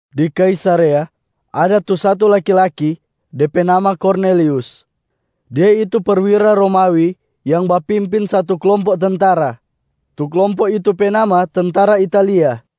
Di Kaisarea ada tu satu laki-laki, de pe nama Kornelius. Dia itu perwira Romawi yang bapimpin satu klompo tentara, tu klompo itu pe nama Tentara Italia.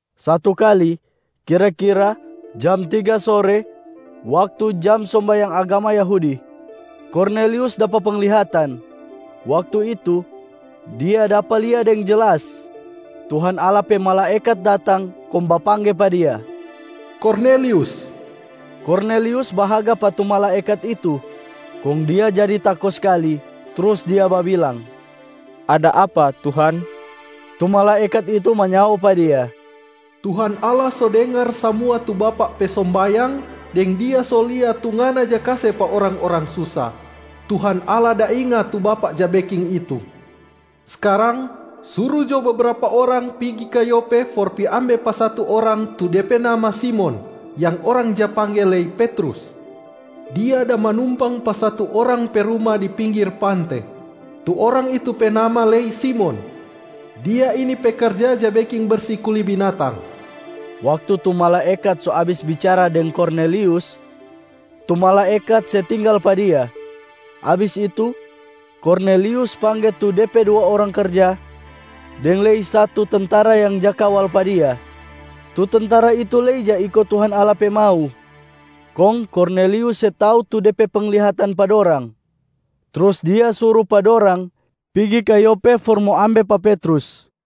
Satu kali, kira-kira jam tiga sore waktu jam sombayang agama Yahudia, Kornelius dapa penglihatan. Waktu itu, dia dapa lia deng jelas Tuhan Allah pe malaekat datang kong bapangge pa dia, “Kornelius!” Kornelius bahaga pa tu malaekat itu kong dia jadi tako skali, trus dia babilang, “Ada apa, Tuhan?” Tu malaekat itu manyao pa dia, “Tuhan Allah so dengar samua tu bapak pe sombayang, deng Dia so lia tu ngana ja kase pa orang-orang susa. Tuhan Allah da inga tu bapak ja beking itu. Skarang, suru jo bebrapa orang pigi ka Yope for pi ambe pa satu orang tu de pe nama Simon, yang orang ja pangge lei Petrus. Dia da manumpang pa satu orang pe ruma di pinggir pante. Tu orang itu pe nama lei Simon. Dia ini pe karja ja beking bersi kuli binatang.” Waktu tu malaekat so abis bicara deng Kornelius, tu malaekat se tinggal pa dia. Abis itu, Kornelius pangge tu de pe dua orang karja deng lei satu tentara yang ja kawal pa dia. Tu tentara itu lei ja iko Tuhan Allah pe mau. Kong Kornelius se tau tu de pe penglihatan pa dorang, trus dia suru pa dorang pigi ka Yope for mo ambe pa Petrus.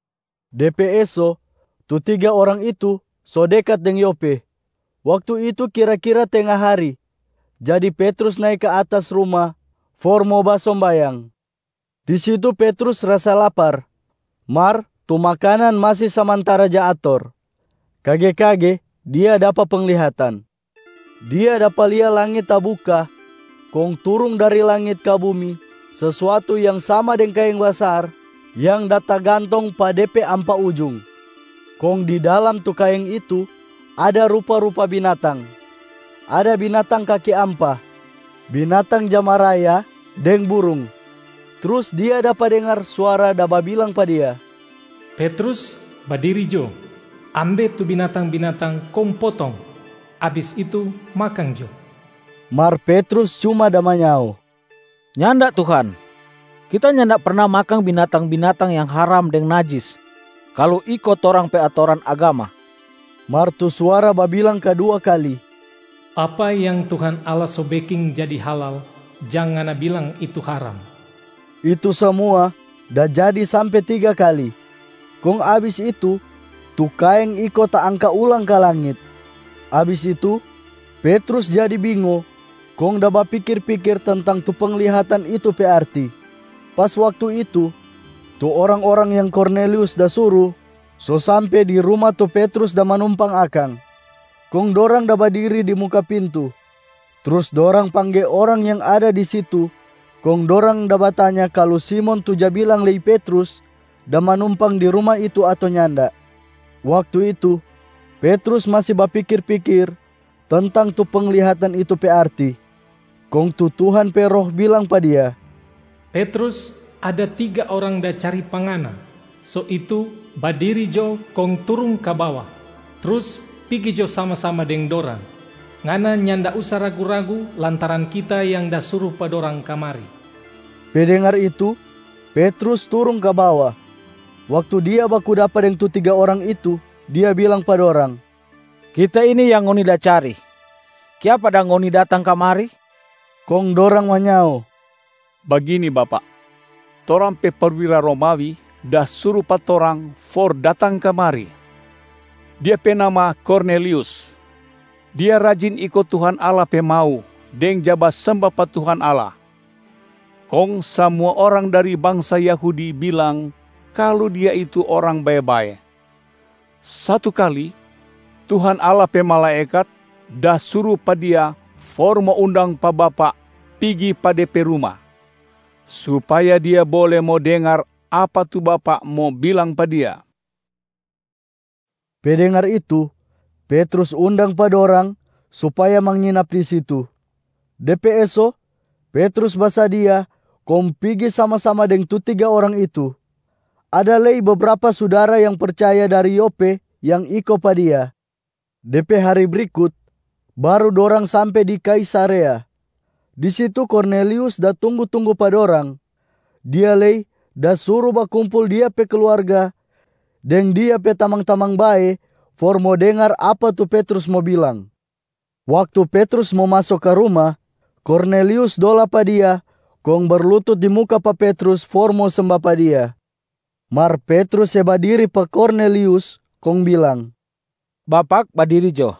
De pe eso, tu tiga orang itu so dekat deng Yope. Waktu itu kira-kira tenga hari, jadi Petrus nae ka atas rumab for mo basombayang. Di situ Petrus rasa lapar, mar tu makanan masi samantara ja ator. Kage-kage dia dapa penglihatan. Dia dapa lia langit tabuka kong turung dari langit ka bumi sesuatu yang sama deng kaeng basar yang da tagantong pa de pe ampa ujung. Kong di dalam tu kaeng itu ada rupa-rupa binatang: ada binatang kaki ampa, binatang ja maraya deng burung. Trus dia dapa dengar suara da babilang pa dia, “Petrus, badiri jo. Ambe tu binatang-binatang kong potong, abis itu makang jo.” Mar Petrus cuma da manyao, “Nyanda Tuhan. Kita nyanda perna makang binatang-binatang yang haram deng najis kalu iko torang pe atoran agama.” Mar tu suara babilang kadua kali, “Apa yang Tuhan Allah so beking jadi halal, jang ngana bilang itu haram.” Itu samua da jadi sampe tiga kali, kong abis itu tu kaeng iko taangka ulang ka langit. Abis itu, Petrus jadi bingo kong da bapikir-pikir tentang tu penglihatan itu pe arti. Pas waktu itu, tu orang-orang yang Kornelius da suru so sampe di ruma tu Petrus da manumpang akang, kong dorang da badiri di muka pintu. Trus dorang pangge orang yang ada di situ kong dorang da batanya kalu Simon tu ja bilang lei Petrus da manumpang di ruma itu ato nyanda. Waktu itu, Petrus masi bapikir-pikir tentang tu penglihatan itu pe arti. Kong tu Tuhan pe Roh bilang pa dia, “Petrus, ada tiga orang da cari pa ngana. So itu badiri jo kong turung ka bawa, trus pigi jo sama-sama deng dorang. Ngana nyanda usa ragu-ragu lantaran Kita yang da suru pa dorang kamari.” Pe dengar itu, Petrus turung ka bawa. Waktu dia baku dapa deng tu tiga orang itu, dia bilang pa dorang, “Kita ini yang ngoni da cari. Kiapa dang ngoni datang kamari?” Kong dorang manyao, “Bagini bapak, torang pe perwira Romawi da suru pa torang for datang kamari. Dia pe nama Kornelius. Dia rajin iko Tuhan Allah pe mau deng ja basemba pa Tuhan Allah. Kong samua orang dari bangsa Yahudi bilang kalu dia itu orang bae-bae. Satu kali, Tuhan Allah pe malaekat da suru pa dia for mo undang pa bapak pigi pa de pe ruma, supaya dia bole mo dengar apa tu bapak mo bilang pa dia.” Pe dengar itu, Petrus undang pa dorang supaya manginap di situ. De pe eso, Petrus basadia kong pigi sama-sama deng tu tiga orang itu. Ada lei bebrapa sudara yang percaya dari Yope yang iko pa dia. De pe hari brikut baru dorang sampe di Kaisarea. Di situ Kornelius da tunggu-tunggu pa dorang. Dia lei da suru bakumpul dia pe kluarga deng dia pe tamang-tamang bae for mo dengar apa tu Petrus mo bilang. Waktu Petrus mo maso ka ruma, Kornelius dola pa dia kong berlutut di muka pa Petrus for mo semba pa dia. Mar Petrus se badiri pa Kornelius kong bilang, “Bapak badiri jo,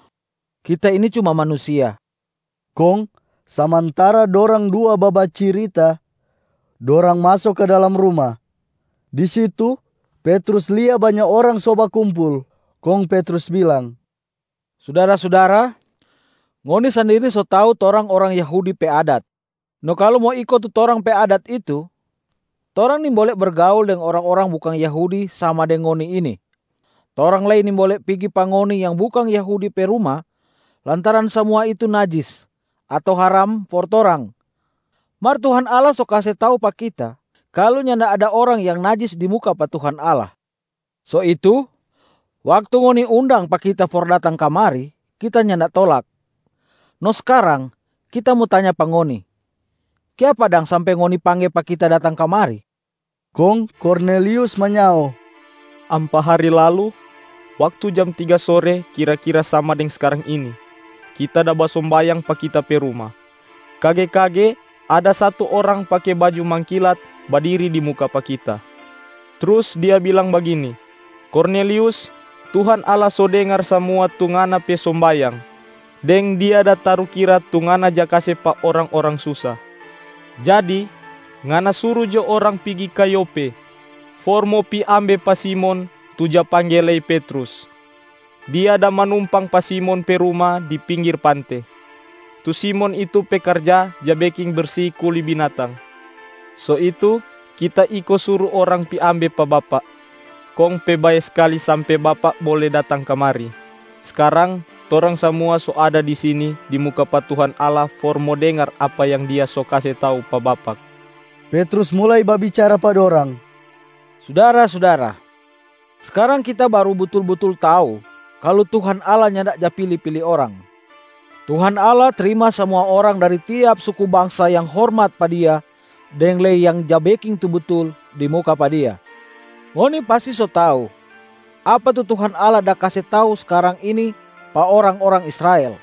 kita ini cuma manusia.” Kong samantara dorang dua babacirita, dorang maso ka dalam ruma. Di situ Petrus lia banya orang so bakumpul. Kong Petrus bilang, “Sudara-sudara! Ngoni sandiri so tau torang orang Yahudi pe adat. No kalu mo iko tu torang pe adat itu, torang nimbole bergaul deng orang-orang bukang Yahudi sama deng ngoni ini, torang lei nimbole pigi pa ngoni yang bukang Yahudi pe ruma lantaran samua itu najis ato haram for torang. Mar Tuhan Allah so kase tau pa kita, kalu nyanda ada orang yang najis di muka pa Tuhan Allah. So itu, waktu ngoni undang pa kita for datang kamari, kita nyanda tolak. No skarang, kita mo tanya pa ngoni, kiapa dang sampe ngoni pangge pa kita datang kamari?” Kong Kornelius manyao, “Ampa hari lalu, waktu jam tiga sore kira-kira sama deng skarang ini, kita da basombayang pa kita pe ruma. Kage-kage ada satu orang pake baju mangkilat badiri di muka pa kita. Trus dia bilang bagini, ‘Kornelius, Tuhan Allah so dengar samua tu ngana pe sombayang, deng Dia da tarukira tu ngana ja kase pa orang-orang susa. Jadi, ngana suru jo orang pigi ka Yope for mo pi ambe pa Simon tu ja pangge lei Petrus. Dia da manumpang pa Simon pe ruma di pinggir pante, tu Simon itu pe karja ja beking bersi kuli binatang.’ So itu kita iko suru orang pi ambe pa bapak, kong pe bae skali sampe bapak bole datang kamari. Skarang, torang samua so ada di sini di muka pa Tuhan Allah for mo dengar apa yang Dia so kase tau pa bapak.” Petrus mulai babicara pa dorang, “Sudara-sudara! Skarang kita baru butul-butul tau kalu Tuhan Allah nyanda ja pili-pili orang. Tuhan Allah trima samua orang dari tiap suku bangsa yang hormat pa Dia deng lei yang ja beking tu butul di muka pa Dia. Ngoni pasti so tau apa tu Tuhan Allah da kase tau skarang ini pa orang-orang Israel.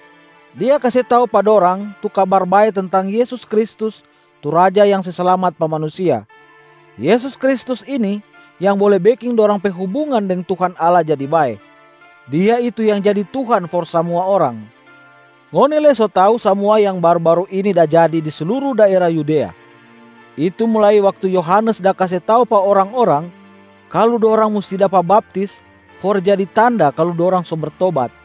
Dia kase tau pa dorang tu Kabar Bae tentang Yesus Kristus tu Raja yang se slamat pa manusia. Yesus Kristus ini yang bole beking dorang pe hubungan deng Tuhan Allah jadi bae. Dia itu yang jadi Tuhan for samua orang. Ngoni lei so tau samua yang baru-baru ini da jadi di sluru daera Yudea. Itu mulai waktu Yohanes da kase tau pa orang-orang kalu dorang musti dapa baptis for jadi tanda kalu dorang so bertobat.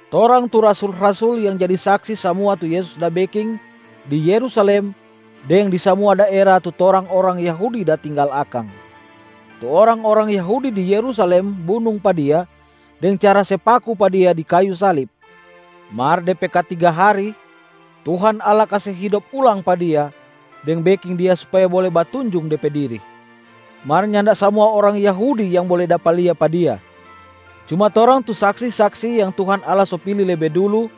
Torang tu rasul-rasul yang jadi saksi samua tu Yesus da beking di Yerusalem deng di samua daera tu torang orang Yahudi da tinggal akang. Tu orang-orang Yahudi di Yerusalem bunung pa Dia deng cara se paku pa Dia di kayu salib. Mar de pe katiga hari, Tuhan Allah kase hidop ulang pa Dia deng beking Dia supaya bole batunjung De pe diri. Mar nyanda samua orang Yahudi yang bole dapa lia pa Dia, cuma torang tu saksi-saksi yang Tuhan Allah so pili lebe dulu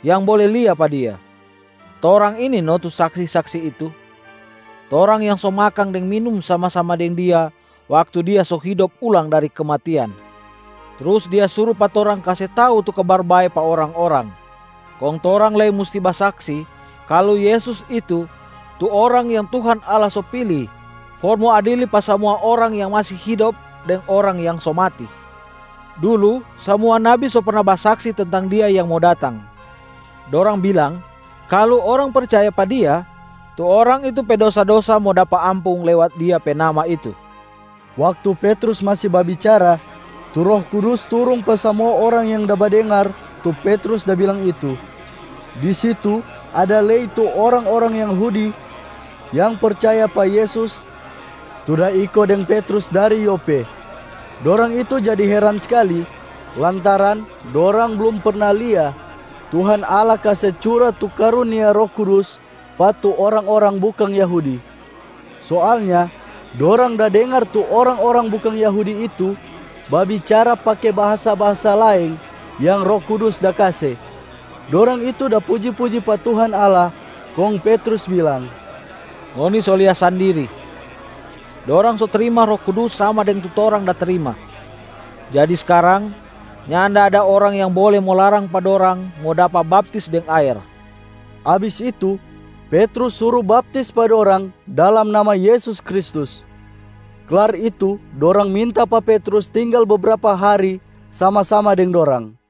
yang bole lia pa Dia. Torang ini no tu saksi-saksi itu. Torang yang so makang deng minum sama-sama deng Dia waktu Dia so hidop ulang dari kematian. Trus Dia suru pa torang kase tau tu Kabar Bae pa orang-orang. Kong torang lei musti basaksi kalu Yesus itu tu Orang yang Tuhan Allah so pili for mo adili pa samua orang yang masi hidop deng orang yang so mati. Dulu, samua nabi so perna basaksi tentang Dia yang mo datang, dorang bilang kalu orang percaya pa Dia, tu orang itu pe dosa-dosa mo dapa ampung lewat Dia pe nama itu.” Waktu Petrus masi babicara, tu Roh Kudus turung pa samua orang yang da badengar tu Petrus da bilang itu. Di situ ada lei tu orang-orang Yahudi yang percaya pa Yesus tu da iko deng Petrus dari Yope. Dorang itu jadi heran skali lantaran dorang blum perna lia Tuhan Allah kase cura tu karunia Roh Kudus pa tu orang-orang bukang Yahudi. Soalnya dorang da dengar tu orang-orang bukang Yahudi itu babicara pake bahasa-bahasa laeng yang Roh Kudus da kase, dorang itu da puji-puji pa Tuhan Allah. Kong Petrus bilang, “Ngoni so lia sandiri! Dorang so trima Roh Kudus sama deng tu torang da trima. Jadi skarang, nyanda ada orang yang bole mo larang pa dorang mo dapa baptis deng aer.” Abis itu, Petrus suru baptis pa dorang dalam nama Yesus Kristus. Klar itu dorang minta pa Petrus tinggal bebrapa hari sama-sama deng dorang.